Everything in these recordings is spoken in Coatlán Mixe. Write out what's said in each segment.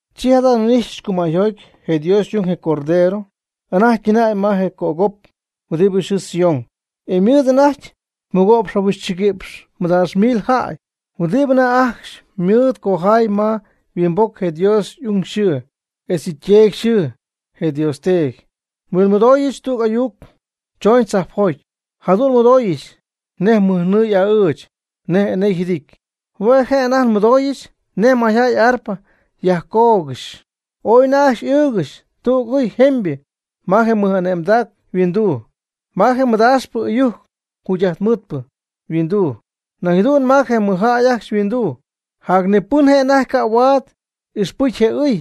Chi jada' nhuin'ixyɨch cumäyjoty je Dios y'ung, je Cordero, anajty ytɨnäy ma je cögop huɨdi yxɨɨ Sión. Ymɨɨd anajty mɨgo'px jahuixchɨguïpx madaax mil jäy huɨdibɨ anajty ajcxy mɨɨd cojay ma yhuimboc je Dios y'ung yxɨɨ, etz yɨ' yTeedy yxɨɨ, je Dios Teedy. Nhuinmɨdooyɨch tüg ayuc chooñ tzajpjoty, jadu'n nmɨdooyɨch nej mɨjnɨɨ y'a'ɨɨch, nej enee yjɨdity. Hue' je' anajty nmɨdooyɨch nej mayjäy y'arpa yajcoogɨxy. Ooy anajty ajcxy ɨɨgɨxy tüg ɨy jemybɨ ma je mɨj'ane'mdac yhuinduu, ma je mɨdaaxpɨ ɨyujc jugy'ajtmɨɨdpɨ yhuinduu, nañ jadu'n ma je mɨjjäy ajcxy yhuinduu. Jac ni pɨn je' anajty ca' huaad ixpɨcy je ɨy,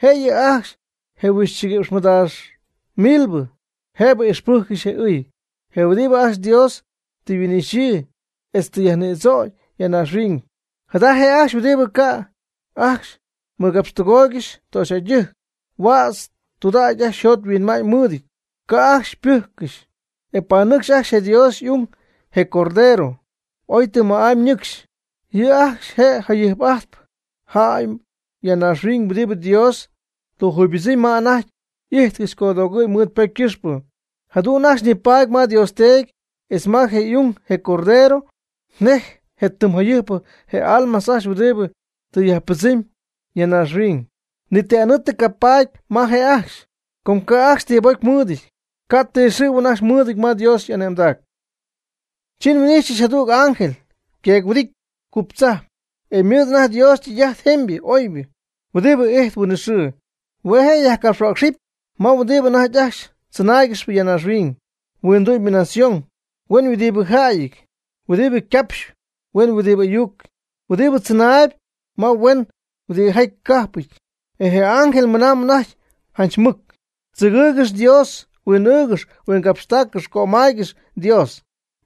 jëyɨ ajcxy je huixchɨguïpx mɨdaax milbɨ jëbɨ ixpɨjccɨxy je ɨy, je huɨdibɨ ajcxy Dios ti yhuin'ixyii etz tɨ yajnïdzögy ya naaxhuiñ. Jada je' ajcxy huɨdibɨ ca' ajcxy mɨgapxtɨgooygɨxy töxyjäydɨjc, huädz tudägy ajcxy yjot yhuinma'ñ mɨɨdɨty, ca' ajcxy pɨjccɨxy. E ypanɨcxyp ajcxy je Dios y'ung, je Cordero, oy tɨm ma'ámy ñɨcxy. Yɨ' ajcxy je jayɨjp'atypɨ jäy ya naaxhuiñ huɨdibɨ Dios tɨ yjuybɨdzɨmy ma anajty ijtcɨxy codoogɨ̈y mɨɨd ypocy ycɨxpɨ. Jadu'n ajcxy nipaady ma Dios Teedy etz ma je' y'ung, je Cordero, nej je tɨm jayɨjpɨ je almas ajcxy huɨdibɨ tɨ yajpɨdzɨmy ya naaxhuiñ. Ni ti anɨɨ tɨ ycayajpaady ma je' ajcxy. Com ca' ajcxy tibocy mɨɨdɨty, ca' ti xɨ̈huɨn ajcxy mɨɨdɨty ma Dios y'ane'mdac. Chi nhuin'ijxyɨch jadüg ángel yqueec-huɨdity cuptzajp, e ymɨɨd anajty Dios ytɨy'ajt jemybɨ oybɨ huɨdibɨ ijtp huinɨxɨɨ. Hue' je' yajcapxhuäcxɨp ma huɨdibɨ anajty ajcxy tzɨnaaygɨxp naaxhuiñ, huindu'my nación, huen huɨdibɨ jäyɨty, huɨdibɨ capxp huen huɨdibɨ ayucɨty, huɨdibɨ tzɨnaayb ma huen huɨdibɨ cajpɨty. E je ángel ymɨna'ñ anajty janch mɨc: ―Tzɨgɨɨygɨx Dios, huin'ɨɨgɨx huinyaaxcɨx cömaygɨx Dios.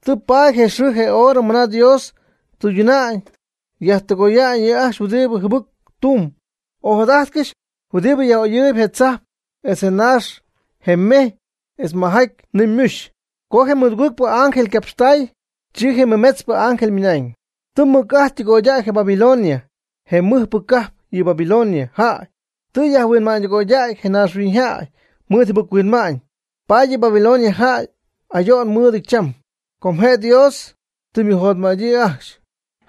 Tɨ paady je xɨɨ je horɨ mɨna Dios tɨyduna'ñ yajtɨgoya'ñ yɨ' ajcxy huɨdibɨ jɨbɨc tumb. Ojadajtcɨx je huɨdibɨ yaj'oyɨɨy je tzajp etz je naax, je mejy etz majaty nɨɨ ymuxy. Co je mɨdügpɨ ángel ycapxtaay, chi je mɨmetzpɨ ángel ymɨnañ: ―Tɨ ymɨc'ajt ytɨgoydäy je Babilonia je mɨjpɨ cajp. Yɨ Babilonia jäy tɨ yajhuinma'ñydɨgoydäy je naaxhuiñyjäy mɨɨd yjɨbɨc-huinma'ñ, paady yɨ Babilonia jäy ayo'n mɨɨdɨty cham, com je Dios tɨ ymɨjotmättäyii ajcxy.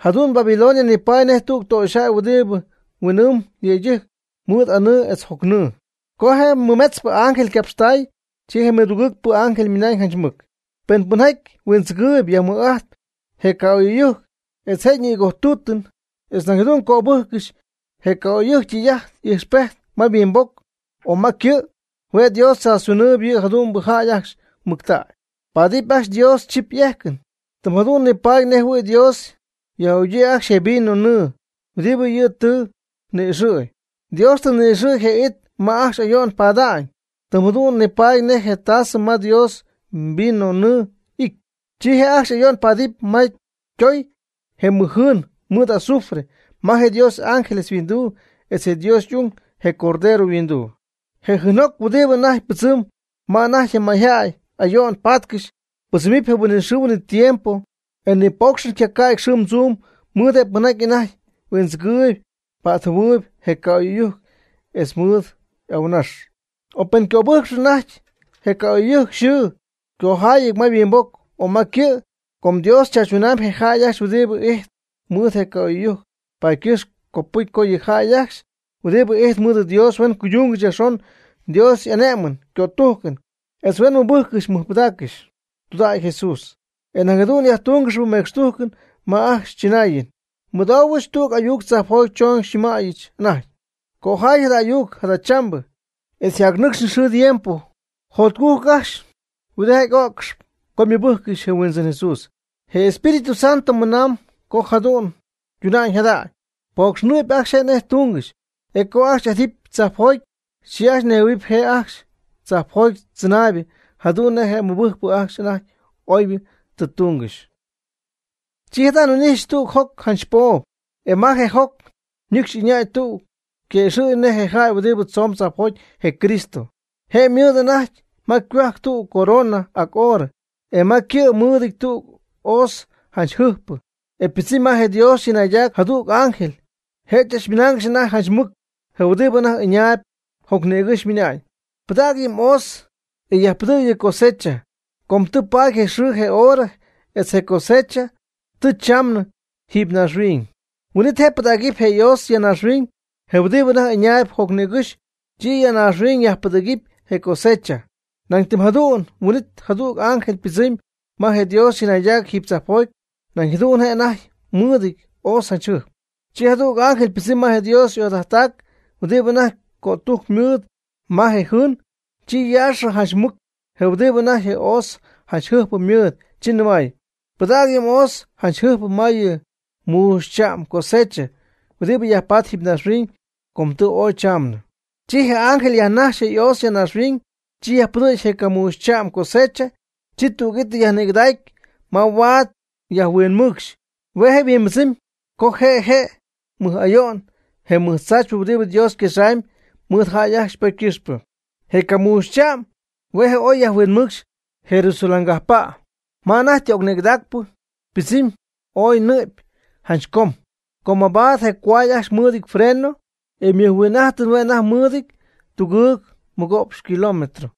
Jadu'n Babilonia nipaady nej tüg töxyjäy huɨdibɨ huin'ɨɨmb yëydɨjctɨjc mɨɨd anɨɨ etz jocnɨɨ. Co je mɨmetzpɨ ángel ycapxtay, chi je mɨdugɨɨgpɨ ángel ymɨnañ janch mɨc: ―Pen pɨnjaty huindzɨgɨɨyb yajmɨj'ajtɨp je ca'oy'ɨyujc etz je ñïgojtuutɨn etz nañ jadu'n cöbɨjccɨxy je ca'oy'ɨyujc ytɨy'ajt y'ijxpejt ma yhuimboc o ma ycɨ', hue' Dios tzaachytunɨɨb yɨ jadu'mbɨ jäy ajcxy mɨctägy, ypaadɨp ajcxy Dios chip y'ejcɨn. Tɨm jadu'n nipaady nej jɨhuɨ̈y Dios yaj'ügyii ajcxy je vino nɨɨ huɨdibɨ yɨ' tɨ ni'ixɨ̈y. Dios tɨ ni'ixɨ̈y je it ma ajcxy ayo'n pada'ñ, tɨm jadu'n nipaady nej je tasɨ ma Dios yvinonɨɨ ijtp. Chi je' ajcxy ayo'n paadɨpy ma ytoy je mɨjjɨɨn mɨɨd azufre ma je Dios y'ángeles yhuinduu etz je Dios y'ung, je Cordero, yhuinduu. Je jɨɨnjoc huɨdibɨ anajty pɨdzɨmb ma anajty je mayjäy ayo'n paatcɨxy, pɨdzɨmɨp je' huinɨxɨɨ huinɨtiempo. E ni poocxɨn ycaca'ty xɨɨm tzuum mɨɨd je pɨnjaty anajty huindzɨgɨɨyb pa'tjɨhuɨɨyb je ca'oy'ɨyujc etz mɨɨd y'ahuɨnax, o pen ycöbɨjcɨpy anajty je ca'oy'ɨyujc yxɨɨ ycojayɨty ma yhuimboc o ma ycɨ'. Com Dios chaachytunamyb je jäy ajcxy huɨdibɨ ijtp mɨɨd je ca'oy'ɨyujc, paady ycɨxp copɨcy co yɨ jäy ajcxy huɨdibɨ ijtp mɨɨd Dios huen cuydungɨxy yajxon Dios y'ane'mɨn ycötujcɨn etz huen mɨbɨjccɨxy mɨjpɨdaaccɨxy tudägy Jesús, etz nañ jadu'n yajtungɨxy mecxtujcɨn ma ajcxy chɨnaayɨn. Nmɨdoohuɨch tüg ayuc tzajpjoty chooñ xyñɨmäyɨch anajty: ―Cojay jada ayuc: “Jadachambɨ etz jacnɨcxpɨ xɨɨ tiempo, jotcujc ajcxy huɨdijaty öccɨxp co mɨbɨjccɨxy je Huindzɨn Jesús.” Je Espíritu Santo ymɨna'ñ co jadu'n tunamb jadamb, pocxnɨp ajcxy nej ytungɨxy, e co ajcxy yjädɨpy tzajpjoty, chi ajcxy nejhuɨ̈huɨp je' ajcxy tzajpjoty tzɨnaaybɨ jadu'n nej je mɨbɨjcpɨ ajcxy anajty oybɨ tɨ tungɨxy. Chi jada' nhuin'ijxyɨch tüg joc janch poob. E ma je joc nïcx ɨñäy tüg yquëxɨ̈gy nej je jäy huɨdibɨ tzoon tzajpjoty (je Cristo). Je' ymɨɨd anajty ma ycohuajc tüg corona ac oorɨ, e ma ycɨ' mɨɨdɨty tüg hoz janch jɨjpɨ. E ypɨdzɨmy ma je Dios chɨnaydac jadüg ángel, je' tzachmɨyäxy anajty janch mɨc je huɨdibɨ anajty ɨñaayb jocnïgɨ́xy, ymɨna'ñ: ―Pɨdäg yɨ mhoz, e yajpɨdɨ̈g yɨ cosecha, com tɨ paady je xɨɨ je horɨ etz je cosecha tɨ chamnɨ jiiby naaxhuiñ. Huin'it je' pɨdacy je' yhoz ya naaxhuiñ, je huɨdibɨ anajty ɨñaayb jocnïgɨ́xy, chi ya naaxhuiñ yajpɨdɨ̈gy je ycosecha. Nañ tɨm jadu'n huin'it jadüg ángel ypɨdzɨmy ma je Dios chɨnaydac jiiby tzajpjoty. Nañ jadu'n je' anajty mɨɨdɨty yhoz janch jɨjp. Chi jadüg ángel ypɨdzɨmy ma je Dios ojadajttac huɨdibɨ anajty cötujc mɨɨd ma je jɨɨn. Chi yaaxɨ janch mɨc je huɨdibɨ anajty je' yhoz janch jɨjpɨ mɨɨd, chi nɨmay: ―Pɨdäg yɨ mhoz janch jɨjpɨ ma yɨ muuxycha'm cosecha huɨdibɨ yajpatp jiiby naaxhuiñ, com tɨ ooy chamnɨ. Chi je ángel yajnajxy je' yhoz naaxhuiñ, chi yajpɨdɨ̈gy je camuuxycha'm cosecha, chi tüg'ítɨy yajnïgɨdacy ma huaad yajhuinmɨɨcxy. Hue' je' yhuimbɨdzɨmy co je' je' je mɨj ayo'n je mɨjtzaachypɨ huɨdibɨ Dios yquexamyb mɨɨd jäy ajcxy ypocy ycɨxpɨ. Je camuuxycha'm hue' je' oy yajhuinmɨɨcxy Jerusalén cajppa'. Ma anajty tɨ y'ocnïgɨdacpɨ ypɨdzɨmy ooy nɨ'py janch com, ycoody mabaad je cohuay ajcxy mɨɨdɨty yfreno, e ymɨjhuin'ajtɨn hue' anajty mɨɨdɨty tugɨɨg mɨgo'px kilómetro.